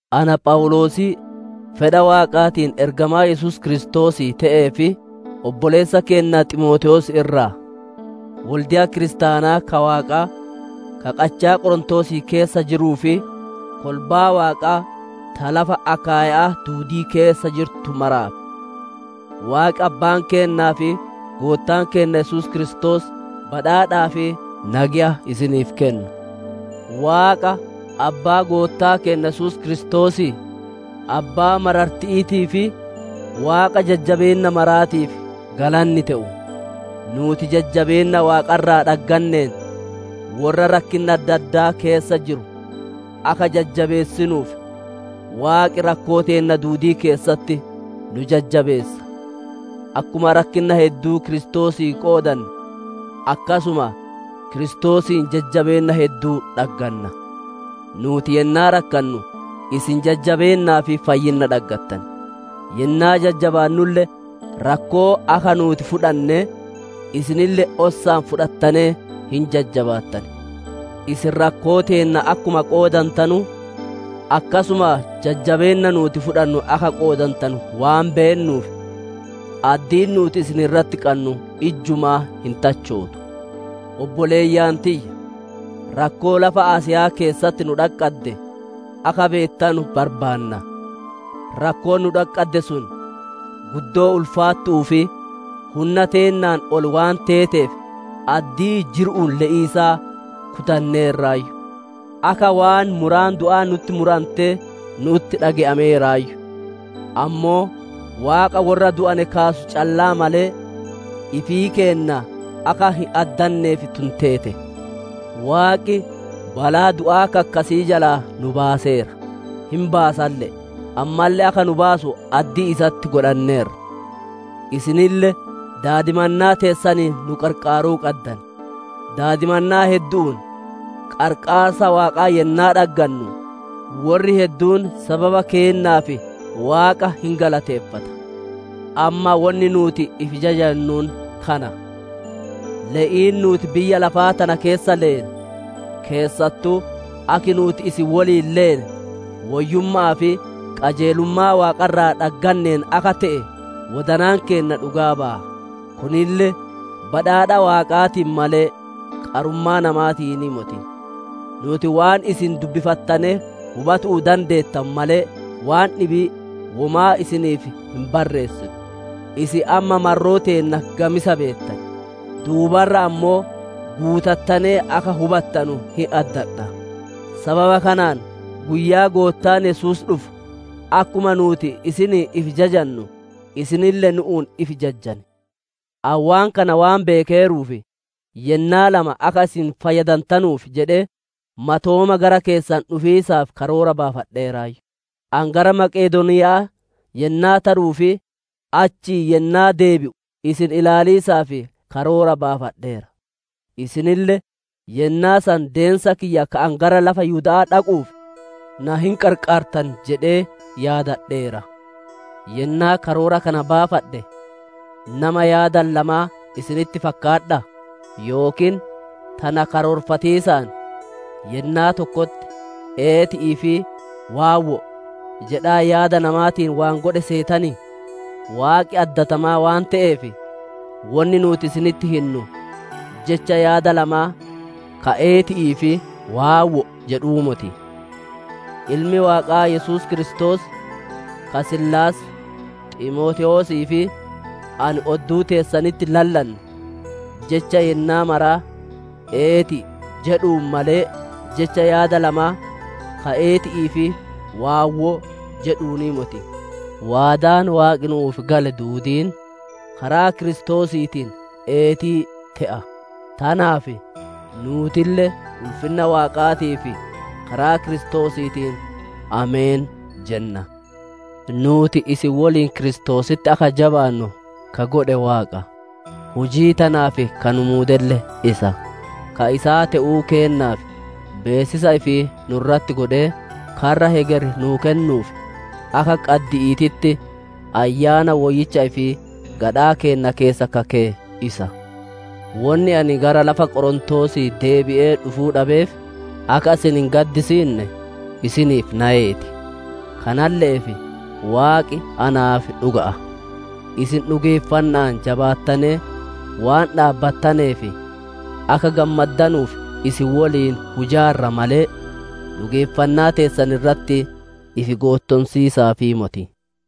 Ana Phawuloosii fedha Waaqaatiin ergamaa Yesuus Kiristoosii te'ee fi obboleessa keenna Ximootewoos irraa: Wolde'a kiristaanaa ka Waaqaa, ka qachaa Qorontoosii keessa jiruu fi kolbaa Waaqaa ta lafa Akaayya'aa duudii keessa jirtu maraaf: Waaqi Abbaan keennaa fi Goottaan keenna Yesuus Kiristoos badhaadhaa fi nageya isiniif kennu. Waaqa Abbaa Goottaa keenna Yesuus Kiristoosii, Abbaa mararti'iitii fi Waaqa jajjabeenna maraatiif galanni te'u. Nuuti jajjabeenna Waaqa irraa dhagganeen, worra rakkinna adda addaa keessa jiru akka jajjabeessinuuf, Waaqi rakkoo teenna duudii keessatti nu jajjabeessa. Akkuma rakkinna hedduu Kiristoosii qoodanne, akkasuma Kiristoosiin jajjabeenna hedduu dhagganna. Nuuti yennaa rakkannu isin jajjabeennaa fi fayyinna dhaggattan; yennaa jajjabaannulle rakkoo akka nuuti fudhannee, isinille ossaan fudhattanee hin jajjabaattan. Isin rakkoo teenna akkuma qoodantanu, akkasuma jajjabeenna nuuti fudhannu akka qoodantanu waan beennuuf, addiin nuuti isin irratti qannu ijjumaa hin tachootu. Obboleeyyan tiyya! Rakkoo lafa Asiya'aa keessatti nu dhaqqadde, akka beettanu barbaanna. Rakkoon nu dhaqqadde sun guddoo ulfaattu'uu fi hunna teennaan ol waan teeteef, addii jiru'uun le'iisaa kutanneerraayyu. Akka waan muraan du'aa nutti murantee nu'utti dhage'ameeraayyu; ammoo Waaqa worra du'ane kaasu callaa malee, ifii keenna akka hin addanneef tun teete. Waaqi balaa du'aa ka akkasii jalaa nu baaseera, hin baasalle'e; ammalle akka nu baasu addii isatti godhanneerra. Isinille daadimannaa teessaniin nu qarqaaruu qaddan. Daadimannaa heddu'uun qarqaarsa Waaqaa yennaa dhaggannu, worri hedduun sababa keennaaf Waaqa hin galateeffata. Amma wonni nuuti ifi jajannuun kana: Le'iin nuuti biyya lafaa tana keessa leene, keessattuu akki nuuti isin woliin leene, woyyumma'aa fi qajeelummaa Waaqa irraa dhagganneen akka te'e wodanaan keenna dhugaa baya. Kunille badhaadha Waaqaatiin malee, qarummaa namaatiinii moti. Nuuti waan isin dubbifattanee hubatu'uu dandeettanu malee, waan dhibii womaa isiniif hin barreessinu. Isin amma marroo teenna gamisa beettan; duuba irra ammoo guutattanee akka hubattanu hin addadha. Sababa kanaan guyyaa Goottaan Yesuus dhufu akkuma nuuti isiniin ifi jajanu, isinille nu'uun ifi jajjan. Ani waan kana waan beekeeruuf, yennaa lama akka isin fayyadantanuuf jedhee, matooma gara keessan dhufiisaaf karoora baafadheeraayyu. Ani gara Maqedooniya'aa yennaa taruu fi achii yennaa deebi'u isin ilaaliisaaf karoora baafadheera. Isinille yennaa san deensa kiyya ka ani gara lafa Yihuda'aa dhaquuf na hin qarqaartan jedhee yaadadheera. Yennaa karoora kana baafadhe, nama yaada lamaa isinitti fakkaadhaa? Yookiin tana karoorfatiisaan yennaa tokkotti «Eeti'ii» fi «Waawwo'o» jedhaa yaada namaatiin waan godhe seetanii? Waaqi addatamaa waan te'eef, wonni nuuti isinitti hinnu jecha yaada lamaa ka «Eeti'ii» fi «Waawwo'o» jedhuu moti. Ilmi Waaqaa Yesuus Kiristoos ka Siilaas, Ximootewoosii fi ani odduu teessanitti lallanne jecha yennaa maraa, «Eeti'i» jedhuun malee, jecha yaada lamaa ka, «Eeti'ii» fi «Waawwo'o» jedhuunii moti. Waadaan Waaqi nu'uuf gale duudiin karaa Kiristoosiitiin, «Eetii» te'a. Tanaaf nuutille ulfinna Waaqaatiif karaa Kiristoosiitiin, «Ameen» jenna. Nuuti isin woliin Kiristoositti akka jabaannu ka godhe Waaqa; hujii tanaaf ka nu muudelle isa. Ka isaa te'uu keennaaf beessisa ifii nu irratti godhee, karra hegeri nuu kennuuf akka qaddi'iititti Ayyaana Woyyicha ifii gadhaa keenna keessa ka keye isa. Wonni ani gara lafa Qorontoosii deebi'ee dhufuu dhabeef, akka isin hin gaddisiinne isiniif nayee ti; kanalle'eef Waaqi naaf dhuga'a. Isin dhugeeffanna'aan jabaattanee waan dhaabbattaneef, akka gammaddanuuf isin woliin hujaarra malee, dhugeeffannaa teessan irratti ifi goottonsiisaafii moti.